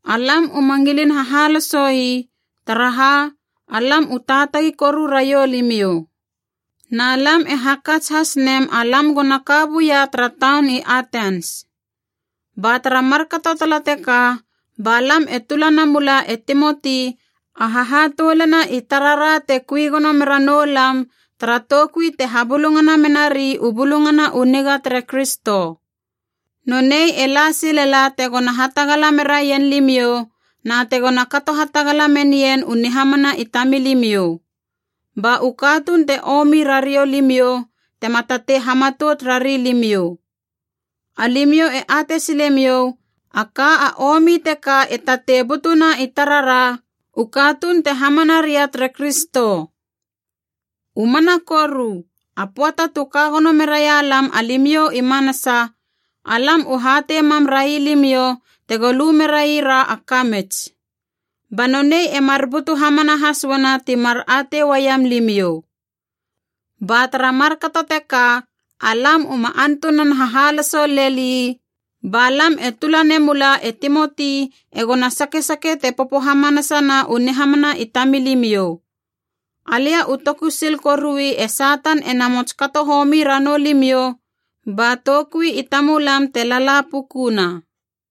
Alam uma ngilin hahalosoi, taraha alam u taatagi koru raiou limiou. Na lam e hakats has nem alam gona ka buia tara taun i Atens. Ba tara markato tala teka ba lam e tula namula e Timoti a hahatoulana i tarara te kui gono mera noulam tara toukui te habulungana menari u Bulungana u Niga tere Kristo. Nonei e la silela tegona hatagala meraien limiou na tegona kato hatagala menien u nihamana i tamilimiou. Ba u katuun te omi ra riou limiou tema tatei hamatout rari limiou. Alimiou e atei silemiou a ka a omi teka e tatei butuna i tarara, u katuun te hamana ria tere Kristo. U mana koru, a pöata tu ka gono meraia lam alimiou i manasa, alam u hatei mam railimiou tego lu merai ra a kamits. Ba nonei e mar butu hamana has uana ti mar atei uaiam limiou. Ba tara markato teka, alam uma antunan hahaloso leli, ba lam e tula namula e Timoti egona sakesake te popo hamanasana u nihamana i tamilimiou. Alia u toku sil korui e Satan e namots kato homi ranou limiou ba toukui i tamulam te lala pukuna.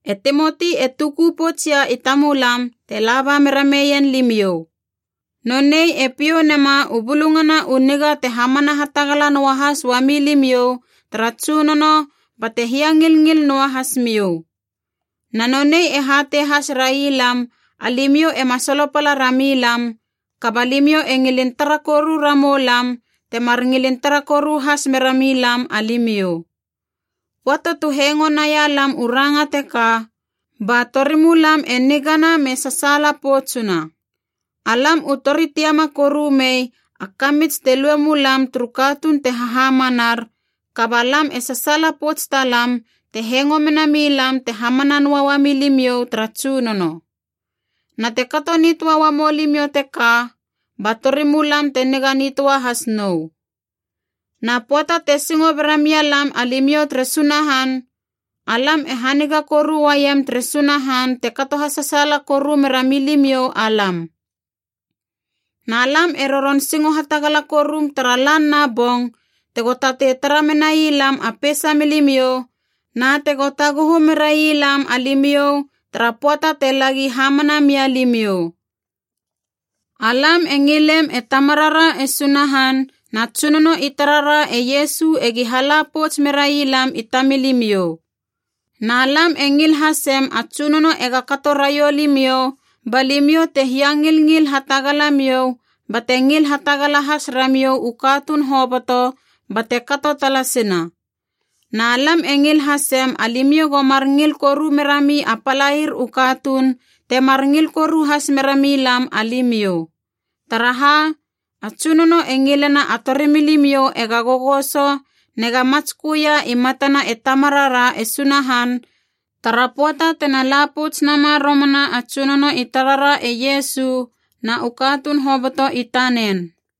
E Timoti e tuku poutsia i tamulam te laba mera meien limiou. Nonei e piou nema u bulungana u niga te hamana hatagala noahas uami limiou tara Tsunono bate hiangilngil noa hasmiou. Na nonei e hatei has railam alimiou ema solopala rami lam, kaba limiou e ngilin tara koru ramou lam temar ngilin tara koru has merami lam alimiou. Pöata tu hengo nai lam u ranga teka, ba torimulam e nigana me sasaala poutsuna. Alam u tori tiama koru mei a kamits te lue mulam turu katuun te hahamanar, kaba lam e sasaala pouts talam te hengo mena milam te hamana noa uami limiou tara Tsunono. Na te kato nitöa uamou limiou teka, ba torimulam te niga nitöa hasi nou. Na pöata te singo bera mia lam alimiou tere Sunahan, alam e haniga koru uaiem tere Sunahan te kato hasasaala koru mera milimiou alam. Na lam e roron singo hatagala korum tara lan na bong tego tatei tara menai lam a peisa milimiou na tego taguhu merai lam alimiou tara pöata te lagi hamana mia limiou. Alam e ngilem e Tamarara e Sunahan na Tsunono i tarara e Iesu egi hala pouts merai lam i tamilimiou. Na lam e ngil hasem a Tsunono ega kato raiou limiou balimiou te hiangilngil hatagalamiou bate ngil hatagala has ramiou u katuun hoboto, bate kato talasina. Na lam e ngil hasem alimiou go mar ngil koru merami a palair u katuun temar ngil koru has mera milam alimiou. Taraha, a Tsunono e ngilena a torimilimiou ega gogoso nega matsköia i matana e Tamarara e Sunahan, tara pöata tena la pouts nama romana a Tsunono i tarara e Iesu na u katuun hoboto i tanen.